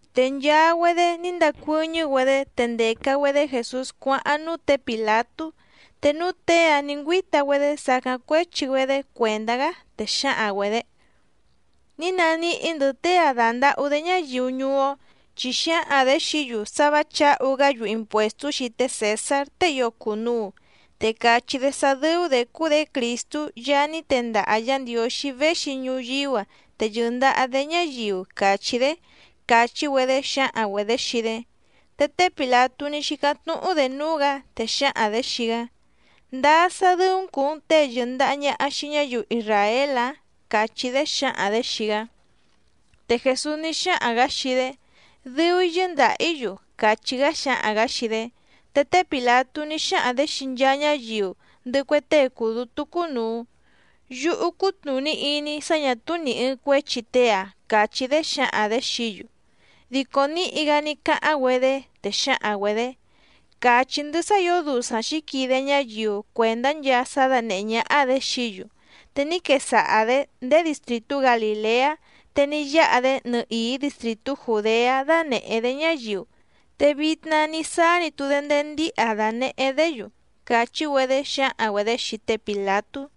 Te nchaa‑güedé ní ndacuɨ́ñɨ́‑güedé, te ndèca‑güedé Jèsús cuáháⁿ núú tě Pìlatú, te núú těe‑áⁿ nǐ ngüíta‑güedé sàcáⁿ cuéchi‑güedé cuèndá‑gá, te xǎhaⁿ‑güedě: —Ní naníhí‑ndɨ̌ tée‑a dàndahú‑dé ñáyiu ñuú‑ó, chi xǎhaⁿ‑dě xií‑yu sá vǎ chǎhu‑gá‑yu impuèstú xii té Cèsár tée ío cùnuu, te càchí‑dé sá dɨ́ú‑dě cúú‑dě Crìstú Yaá ní tendaha Yǎ Ndiǒxí véxi ñuyíú‑a te yɨ̀ndaha‑dé ñáyiu càchí‑dé —càchí‑güedé xǎhaⁿ‑güedě xii‑dé. Te té Pìlatú ní xícáⁿ tnúhu‑dé núú‑gǎ, te xǎhaⁿ‑dě xii‑gá: —¿Ndáá sá dɨ́ú‑n cùu‑n tée yɨ̀ndaha ñaha xii ñáyiu isràél‑ǎⁿ? —càchí‑dé xǎhaⁿ‑dě xii‑gá. Te Jèsús ní xáhaⁿ‑gǎ xii‑dé: —Dɨu‑í yɨ́ndàha‑í‑yu —càchí‑gá xáhaⁿ‑gǎ xii‑dé. Te té Pìlatú ní xáhaⁿ‑dě xii nchaa ñáyiu, ndɨhɨ cue tée cùu dútú cúnùu: —Yúhú cútnùní iní‑í sá ñà túú nì ɨɨⁿ cuéchi tée‑a —càchí‑dé xǎhaⁿ‑dě xií‑yu. Dico níhi‑gá ní cáháⁿ‑güedé, te xǎhaⁿ‑güedě: —Càchí‑ndɨ́ sá ǐo dusaⁿ xǐquide ñáyiu cuèndá nchaa sá dánèhé ñáhá‑dě xií‑yu, te ní quesaha‑dě ndéé distrìtú Galìleá, te ní yáha‑dé nɨhìí distrìtú Jùdeá dánèhé‑dé ñáyiu, te vitna ní sáá‑ni‑tu‑dé ndéé ndíha dànehé‑dé‑yu —càchí‑güedé xǎhaⁿ‑güedě xii té Pìlatú.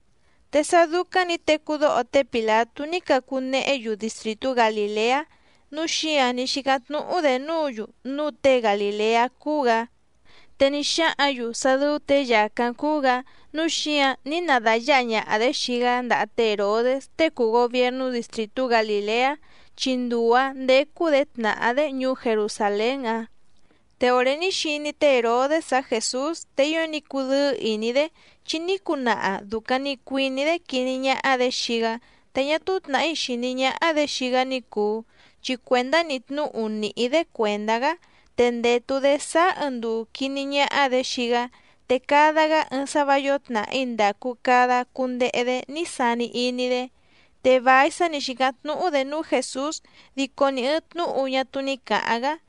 Te sá dúcáⁿ nǐ tecú dóho té Pìlatú ní cacu nehé‑yu distrìtú Galìleá, núu xíǎⁿ ní xícáⁿ tnúhú‑dě núǔ‑yu núu tée Galìleá cúú‑gǎ. Te ní xáhǎⁿ‑yu sá dɨ́ú těe yàcáⁿ cúú‑gǎ, núu xíǎⁿ ní na dàyáha ñaha‑dě xii‑gá ndaha té Hèrodés tée cùu gobiernú distrìtú Galìleá chi nduu‑ǎⁿ ndécú‑dě tnàhá‑dé ñuú Jerusàlén‑áⁿ. Te òré ní xiní té Hèrodés‑áⁿ Jèsús te ío ní cudɨ́ɨ́ ìní‑dé, chi ní cunaha dùcaⁿ‑ni cuiní‑dé quiní ñáhá‑dě xii‑gá te ñá túú tnàhí xìní ñáhá‑dě xii‑gá ní cùu, chi cuèndá‑ni tnúhu nìhí‑dé cuèndá‑gá, te ndètu‑dé sáá ɨɨⁿ nduu quìní ñáhá‑dě xii‑gá, te cada‑gá ɨɨⁿ sá vǎ yǒo tnàhí ndàcu cada cundehe‑dé ní sani iní‑dé. Te vài sá nǐ xícáⁿ tnúhú‑dě núú Jèsús, dico ni ɨ̀ɨⁿ tnúhu ñá túú ní cǎháⁿ‑gá.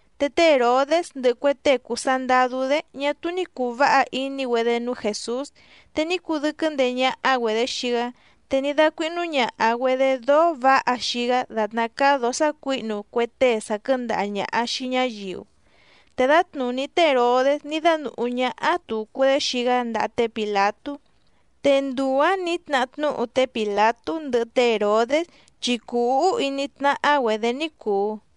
Te té Hèrodés ndɨhɨ cue tée cùu sandadú‑dé ñá túú ní cùu váha iní‑güedé núú Jèsús, te ní cudɨ́quɨ́ ndeé ñáhá‑güedě xii‑gá, te ní dácuíhnú ñàha‑güedé dóó vǎha xii‑gá dàtná cáá dǒó sácuǐhnu cue tée sàquɨ́ndaha ñàha xii ñáyiu. Te dǎtnùní té Hèrodés ní dánùhú ñáhá tùcu‑dé xii‑gá ndaha té Pìlatú. Te nduu‑ǎⁿ nǐ tnahá tnúhu té Pìlatú ndɨhɨ té Hèrodés, chi cùu úhú iní tnáhá‑güedě ní cùu.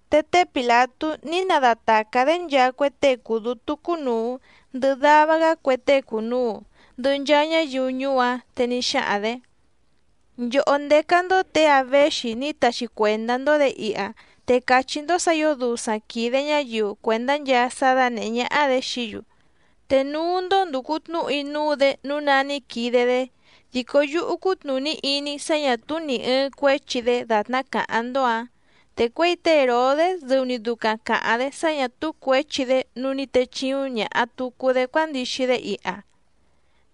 Te té Pìlatú ní nadatàcá‑dé nchaa cue tée cùu dútú cúnùu ndɨhɨ dava‑gá cue tée cùnuu, ndɨhɨ nchaa ñáyiu ñuú‑áⁿ, te ní xáhaⁿ‑dě: —Nchòhó ndécá‑ndó těe‑a véxi ní taxi cuèndá‑ndó‑dě iha, te càchí‑ndó sǎ ǐo dusaⁿ quìde ñáyiu cuèndá nchaa sá dánèhé ñáhá‑dě xií‑yu, te núú‑ndó ndùcu tnúhu‑í núú‑dě nǔu ná ní quide‑dé. Dico yúhú cútnùní iní‑í sá ñà túú nì ɨɨⁿ cuéchi‑dé dàtná càháⁿ‑ndó‑ǎⁿ. Te cuěi té Hèrodés dɨu‑ni ducaⁿ càháⁿ‑dé sá ñà túú cuěchi‑dé nǔu ní techìuⁿ ñaha tucu‑dé cuándixi‑dé iha.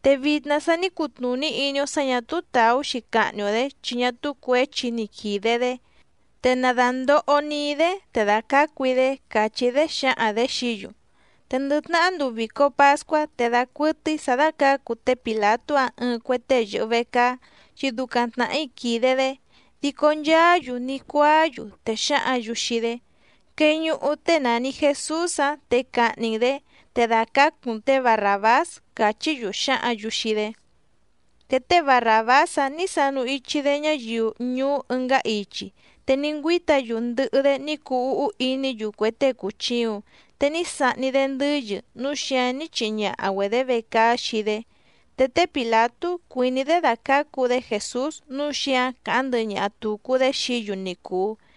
Te vitna sa ní cutnùní iní‑ó sǎ ñà túú tàú‑xi cahni‑o‑dě chi ñá túú cuěchi ni quìde‑dé. Te na dàndoho‑ni‑í‑dé te dàcácu‑í‑dé —càchí‑dé xǎhaⁿ‑dě xií‑yu. Te ndɨ tnahá nduu vìco pascuá te dacuɨtɨ́í sǎ dácǎcu té Pìlatú‑áⁿ ɨɨⁿ cue tée yɨ̀hɨ vecaá, chi ducaⁿ tnàhí quìde‑dé. Dico nchaá‑yu ní cuáá‑yu, te xǎhǎⁿ‑yu xii‑dé: —¡Queñuhu tée nàni Jesús‑áⁿ, te cahni‑n‑dě! ¡Te dàcácu‑n tě Barràbás! —càchí‑yu xǎhǎⁿ‑yu xii‑dé. Te té Barràbás‑áⁿ nǐ sanu ichi‑dé ñáyiu ñuú ɨngá ichi, te ní ngüíta‑yu ndɨhɨ‑dé ní cuu úhú iní‑yu cue tée cùchiuⁿ, te ní sahni‑dé ndɨ́yɨ núu xíǎⁿ ní chihi ñaha‑güedě vecaá xii‑dé. Te té Pìlatú cuìní‑dé dàcácu‑dé Jèsús nǔu xíǎⁿ càháⁿ ndɨhɨ ñaha tùcu‑dé xií‑yu ni cùu,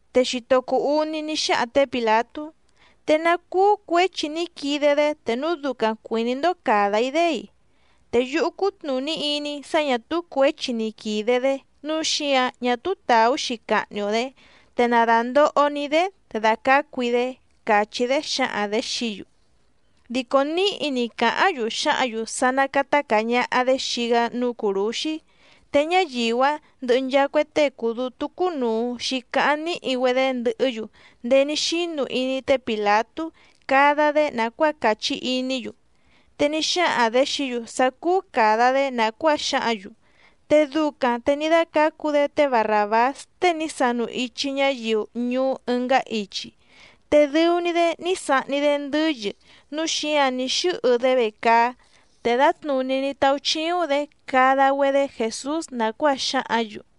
Te xito cuu úní ní xáhaⁿ tě Pìlatú: —¿Te ná cúú cuěchi ní quide‑dé te núu ducaⁿ cuìní‑ndó càda‑í‑dé‑i? Te yúhú cútnùní iní‑í sá ñà túú cuěchi ni quìde‑dé nǔu xíǎⁿ ñá túú tàú‑xi cahni‑o‑dě, te na dàndoho‑ni‑í‑dé te dàcácu‑í‑dé —càchí‑dé xǎhaⁿ‑dě xií‑yu. Dico níhi‑ni càháⁿ‑yu xǎhǎⁿ‑yu sá ná càta caa ñaha‑dé xii‑gá núú cùrúxí, te ñáyiu‑áⁿ ndɨhɨ nchaa cue tée cùu dútú cúnùu xícáháⁿ níhi‑güedé ndɨhɨ́‑yu ndéé ní xínu iní té Pìlatú cada‑dé nàcuáa càchí iní‑yu. Te ní xáhaⁿ‑dě xií‑yu sá cúú càda‑dé nàcuáa xǎhǎⁿ‑yu. Te ducaⁿ te ní dácǎcu‑dé té Barràbás tée ní sanu ichi ñáyiu ñuú ɨngá ichi, te dɨu‑ni‑dé ní sahni‑dé ndɨ́yɨ núu xíǎⁿ ní xɨ́hɨ‑dé vecaá, te dǎtnùní ní táúchíúⁿ‑dě cada‑güedé Jèsús nàcuáa xǎhǎⁿ‑yu.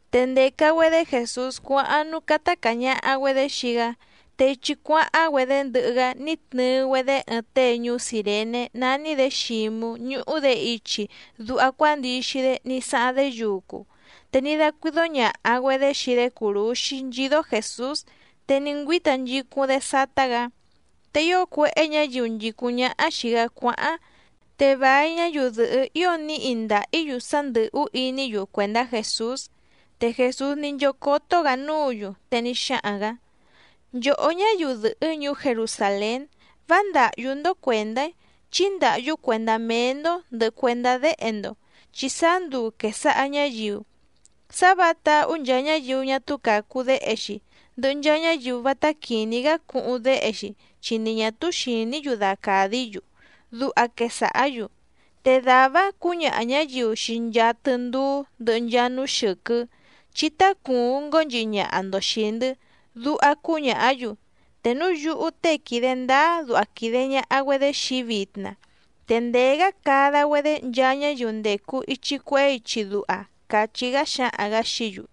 Te ndèca‑güedé Jèsús cuáháⁿ núú cátá càa ñaha‑güedé xii‑gá, te ichi cuáháⁿ‑güedé ndɨhɨ‑gá ní tnɨɨ‑güedé ɨɨⁿ tée ñuú Cìrené nání‑dě Xǐmú ñúhú‑dě ichi duha cuándixi‑dé ní sáháⁿ‑dé yucu, te ní dácuídó ñàha‑güedé xii‑dé cùrúxí nchídó Jèsús, te ní ngüíta nchicúⁿ‑dé sátá‑gǎ. Te ío cuéhé ñǎyiu nchìcúⁿ ñáhá xìi‑gá cuáháⁿ, te vài ñáyiu dɨ̀hɨ́ ío níhi ndàhí‑yu sá ndɨ̀hú iní‑yu cuèndá Jèsús. Te Jèsús ní nchócótó‑gǎ núǔ‑yu, te ní xáhaⁿ‑gǎ: —Nchòhó ñáyiu dɨ̀hɨ́ ñuú Jerusàlén, vá ndàhyú‑ndó cuèndá‑í chí ndàhyú cuèndá méé‑ndó ndɨ̀hɨ cuendá déhe‑ndo. Chi sáá nduu quèsaha ñáyiu: “Sá vǎha táhú nchaa ñáyiu ñá túú càcu déhe‑xi, ndɨhɨ nchaa ñáyiu vátá quìní‑gá cuhuⁿ déhe‑xi, chi ni ñà túú xìní‑yu dacàdí‑yu”, duha quesàhá‑yu. Te dàvá‑áⁿ cǔñaha ñǎyiu xii nchaa tɨndúú ndɨhɨ nchaa núú xɨ̀quɨ́: “Chí tácùuⁿ ngónchihi ñaha‑ndo xìi‑ndɨ́”, duha cúñàhá‑yu. Te núu yúhú tée quìde ndáá duha quìde ñaha‑güedé xii‑í vitna, te ndèé‑gá cada‑güedé nchaa ñáyiu ndècu ichi cuehé ichi duha —càchí‑gá xáhaⁿ‑gǎ xií‑yu.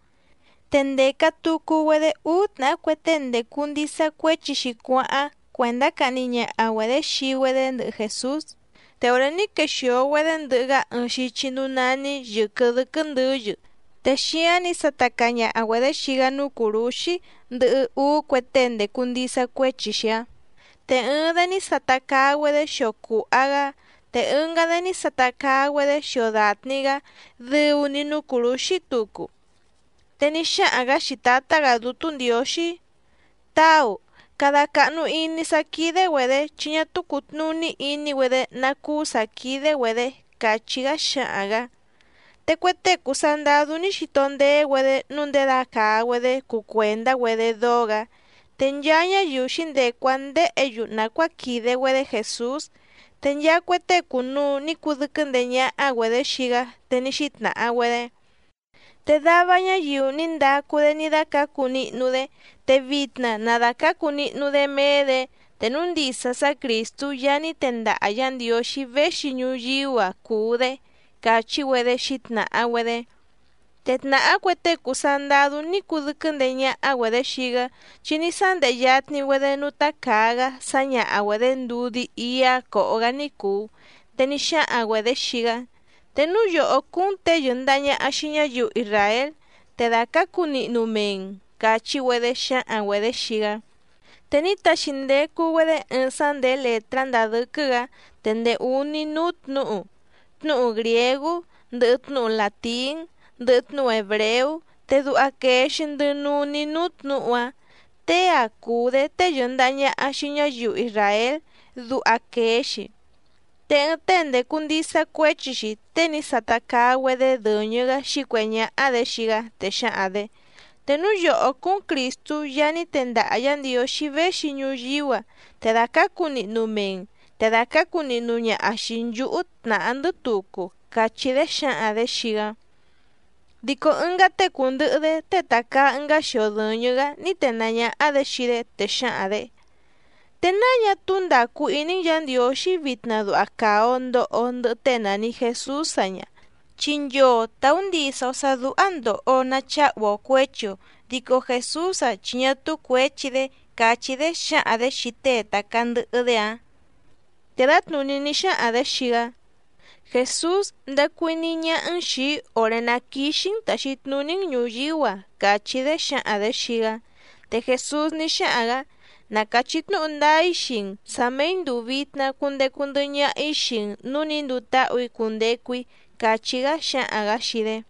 Te ndèca tucu‑güedé úú tnàhá cue tée ndècu ndisa cuéchi‑xi cuáháⁿ cuèndá cahni ñaha‑güedě xii‑güedé ndɨhɨ Jèsús. Te òré ní quexìo‑güedé ndɨhɨ‑gá ɨɨⁿ xichi núú nání Yɨ̀quɨ Dɨ́quɨ́ Ndɨ̌yɨ, te xíáⁿ nǐ sata caa ñaha‑güedě xii‑gá núú cùrúxí, ndɨhɨ úú cue tée ndècu ndisa cuéchi‑xi‑áⁿ, te ɨɨⁿ‑dé ní sata caa‑güedé xio cùha‑gá te ɨngá‑dé ní sata caa‑güedé xio dàtni‑gá dɨu‑ni núú cùrúxí tucu. Te ní xáhaⁿ‑gǎ xii Tǎtá‑gǎ Dútú Ndiǒxí: —Táu, cada càhnu iní sá quídé‑güedě, chi ñá túú cùtnuní iní‑güedé ná cúú sǎ quídé‑güedě —càchí‑gá xáhaⁿ‑gǎ. Te cue tée cùu sandadú ní xito ndéé‑güedé nǔu ndědacàa‑güedé cuu cuèndá‑güedé dóó‑gǎ. Te nchaa ñáyiu xǐndecu‑áⁿ ndéhě‑yu nàcuáa quìde‑güedé Jèsús, te nchaa cue tée cùnuu ní cudɨ́quɨ́ ndeé ñáhá‑güedě xii‑gá, te ní xítnàha‑güedé: —Te dava ñáyiu ní ndacu‑dé ní dácǎcu nihnu‑dé, te vitna na dàcácu nihnu‑dé méé‑dě, te núu ndisa sá Crìstú Yaá ní tendaha Yǎ Ndiǒxí véxi ñuyíú‑a cùu‑dé —càchí‑güedé xǐtnàha‑güedé. Te tnàhá cue tée cùu sandadú ní cudɨ́quɨ́ ndeé ñáhá‑güedě xii‑gá, chi ní sándehe yatni‑güedé núú tácàa‑gá sǎñaha‑güedě ndudí íá còho‑gá ní cùu, te ní xáhaⁿ‑güedě xii‑gá: —Te núu yòhó cúú‑n těe yɨ̀ndaha ñaha xii ñáyiu isràél, te dàcácu nihnu mee‑n —càchí‑güedé xǎhaⁿ‑güedě xii‑gá. Te ní taxi ndecu‑güedé ɨɨⁿ sá ndèé lètrá ndàa dɨ́quɨ́‑gǎ te ndèé úní núú tnǔhu, tnúhu grìégú, ndɨhɨ tnúhu làtín, ndɨhɨ tnúhu hèbreú, te duha quèe‑xi ndɨ nuní núú tnǔhu‑áⁿ “Tée‑a cùu‑dé tée yɨ̀ndaha ñaha xii ñáyiu isràél”, duha quèe‑xi. Te ɨɨⁿ tée ndècu ndisa cuéchi‑xi, tée ní sata caa‑güedé dɨ̀ñɨ‑gá xǐcuèhé ñáhá‑dě xii‑gá, te xǎhaⁿ‑dě: —Te núu yòhó cúú‑n Crìstú Yaá ní tendaha Yǎ Ndiǒxí véxi ñuyíú‑a, te dàcácu nihnu mee‑n, te dàcácu nihnu ñaha xìi nchúhú tnàhá‑ndɨ́ tucu —càchí‑dé xǎhaⁿ‑dě xii‑gá. Dico ɨngá tée cùndɨhɨ‑dé tée tàcaa ɨngá xio dɨ̀ñɨ‑gá ní tenàá ñáhá‑dě xii‑dé, te xǎhaⁿ‑dě: —¿Te náa ñá túú ndàcu iní‑n Yǎ Ndiǒxí vitna duha càa‑o ndoho‑o ndɨhɨ tée nàni Jesús‑a ñǎ? Chi nchoo tàú ndisa‑o sǎ dúhá ndòho‑o nacháhu‑o cuěchi‑o, dico Jèsús‑a chi ñá túú cuěchi‑dé —càchí‑dé xǎhaⁿ‑dě xii tée tàcaa ndɨhɨ‑dé‑áⁿ. Te dǎtnùní ní xáhaⁿ‑dě xii‑gá: —Jèsús, ndacu iní ñáhá‑n xìi‑í òré ná quìxi‑n taxi tnuní‑n ñùyíú‑a —càchí‑dé xǎhaⁿ‑dě xii‑gá. Te Jèsús ní xáhaⁿ‑gǎ: —Na càchí tnúhu ndáá‑í xii‑n sǎ méí ndùu vitna cundecu ndɨhɨ ñaha‑í xii‑n nǔú nǐ nduu táhù‑í cundecu‑í —càchí‑gá xáhaⁿ‑gǎ xii‑dé.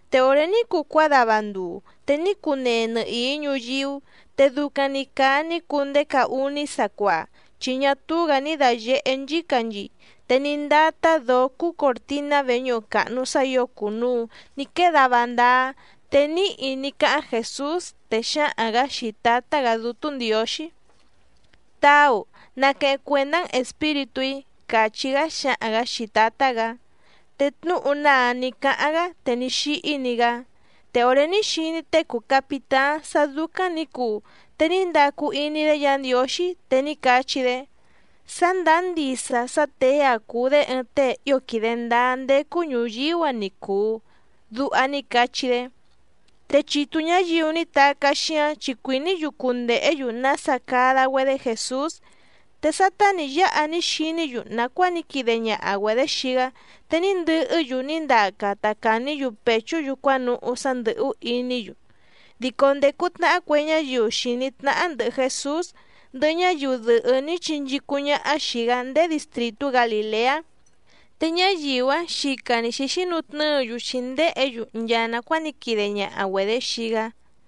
Te òré ní cuu cuádava nduu. Te ní cunee nɨhìí ñuyíú, te ducaⁿ‑ni càa ní cuu ndéé caá úní sacuaa. Chi ñá túú‑gǎ ní dàyehé nchícanchii te ní ndátá dǒó cúú còrtiná veñúhu càhnu sá ǐo cùnuu ní quée dava ndáá. Te níhi ní cáháⁿ Jèsús, te xáhaⁿ‑gǎ xii Tǎtá‑gǎ Dútú Ndiǒxí: —Táu, naqueheⁿ cuèndá‑n espíritú‑í —càchí‑gá xáhaⁿ‑gǎ xii Tǎtá‑gǎ. Te tnúhu‑ná‑áⁿ nǐ cáháⁿ‑gá te ní xíhí‑ni‑gá. Te òré ní xiní tée cùu capitáⁿ sá dúcáⁿ nǐ cuu, te ní ndacu iní‑dé Yǎ Ndiǒxí, te ní cachí‑dé: —Sá ndàá ndisa sá těe‑a cùu‑dé ɨɨⁿ tée ío quìde ndáá ndécú ñùyíú‑a ni cùu —duha ní cachí‑dé. Te chitu ñǎyiu ní tacá xíáⁿ chi cuìní‑yu cundèhé‑yu nása cada‑güedé Jèsús. Te sátá nǐ yáha ní xiní‑yu nàcuáa ní quide ñaha‑güedě xii‑gá, te ní ndɨhɨ́‑yu ní ndaca ta càní‑yu pèchú‑yu cuánuhú sá ndɨ̀hú iní‑yu. Dico ndècu tnahá cue ñáyiu xìní tnáhá ndɨ̀hɨ Jesús, ndɨhɨ ñáyiu dɨ̀hɨ́ ní chinchícúⁿ ñáhá xìi‑gá ndéé distrìtú Galìleá, te ñáyiu‑áⁿ xica‑ni xǐxínutnɨ́ɨ‑yu xǐndéhě‑yu nchaa nàcuáa ní quide ñaha‑güedě xii‑gá.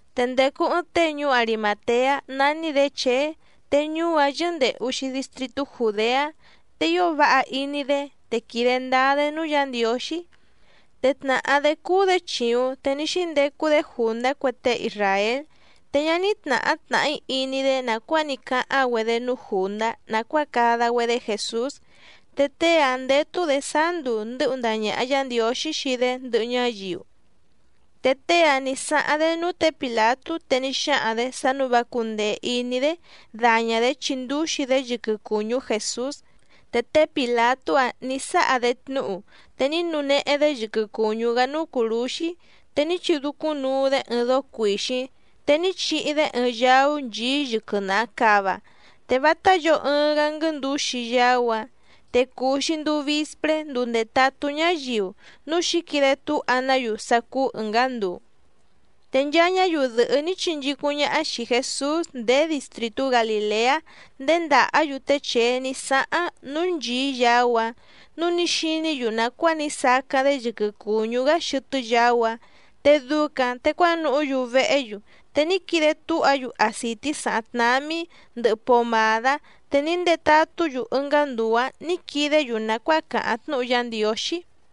Te ndècu ɨɨⁿ tée ñuú Arimàteá nání‑dě Chèé, te ñuú‑áⁿ yɨ́ndèhu‑xi distritú Jùdeá, te ío váha iní‑dé te quìde ndáá‑dé núú Yǎ Ndiǒxí, te tnàhá‑dé cúú‑dě chìuⁿ te ní xíndecu‑dé jùndá cue tée isràél. Te ñá ní tnàhá tnàhí iní‑dé nàcuáa ní cáháⁿ‑güedé núú jùndá nàcuáa cada‑güedé Jèsús. Te tée‑áⁿ ndétú‑dě sáá nduu ndɨ́hu ndaha ñàha Yá Ndiǒxí xii‑dé ndɨhɨ ñáyiu. Te tée‑áⁿ nǐ sáháⁿ‑dé núú tě Pìlatú te ní xáhaⁿ‑dě sá nǔu vá cúndèe iní‑dé daña‑dě chindúxi‑dé yɨquɨ cùñú Jèsús. Te té Pìlatú‑áⁿ nǐ sáha‑dé tnúhu. Te ní nunehe‑dé yɨquɨ cùñú‑gá núú cùrúxí, te ní chidúcúⁿnuu‑dé ɨɨⁿ dóó cuìxíⁿ, te ní chihi‑dé ɨɨⁿ yaú nchìí yɨquɨ naha càva, te vátá yǒo ɨɨⁿ‑gá nguɨ́ndǔxi yaú‑áⁿ. Te cùu‑xi nduu vispré nduu ndètatú ñáyiu, núu xǐquide túha‑ná‑yu sá cúú ɨ̀ngá nduu. Te nchaa ñáyiu dɨ̀hɨ́ ní chinchícúⁿ ñáhá xìi Jesús ndéé distrìtú Galìleá nděndàhá‑yu té Chèé ní sáháⁿ núú nchìí yaú‑áⁿ, núu ní xiní‑yu nàcuáa ní sacáⁿ‑dé yɨquɨ cùñú‑gá xɨtɨ́ yaú‑áⁿ. Te ducaⁿ te cuánuhú‑yu vehé‑yu, te ní quide túha‑yu acìtí sàháⁿ tnámí, ndɨhɨ pomàdá, te ní ndetatú‑yu ɨngá nduu‑ǎⁿ nǐ quidé‑yu nàcuáa càháⁿ tnúhu Yá Ndiǒxí.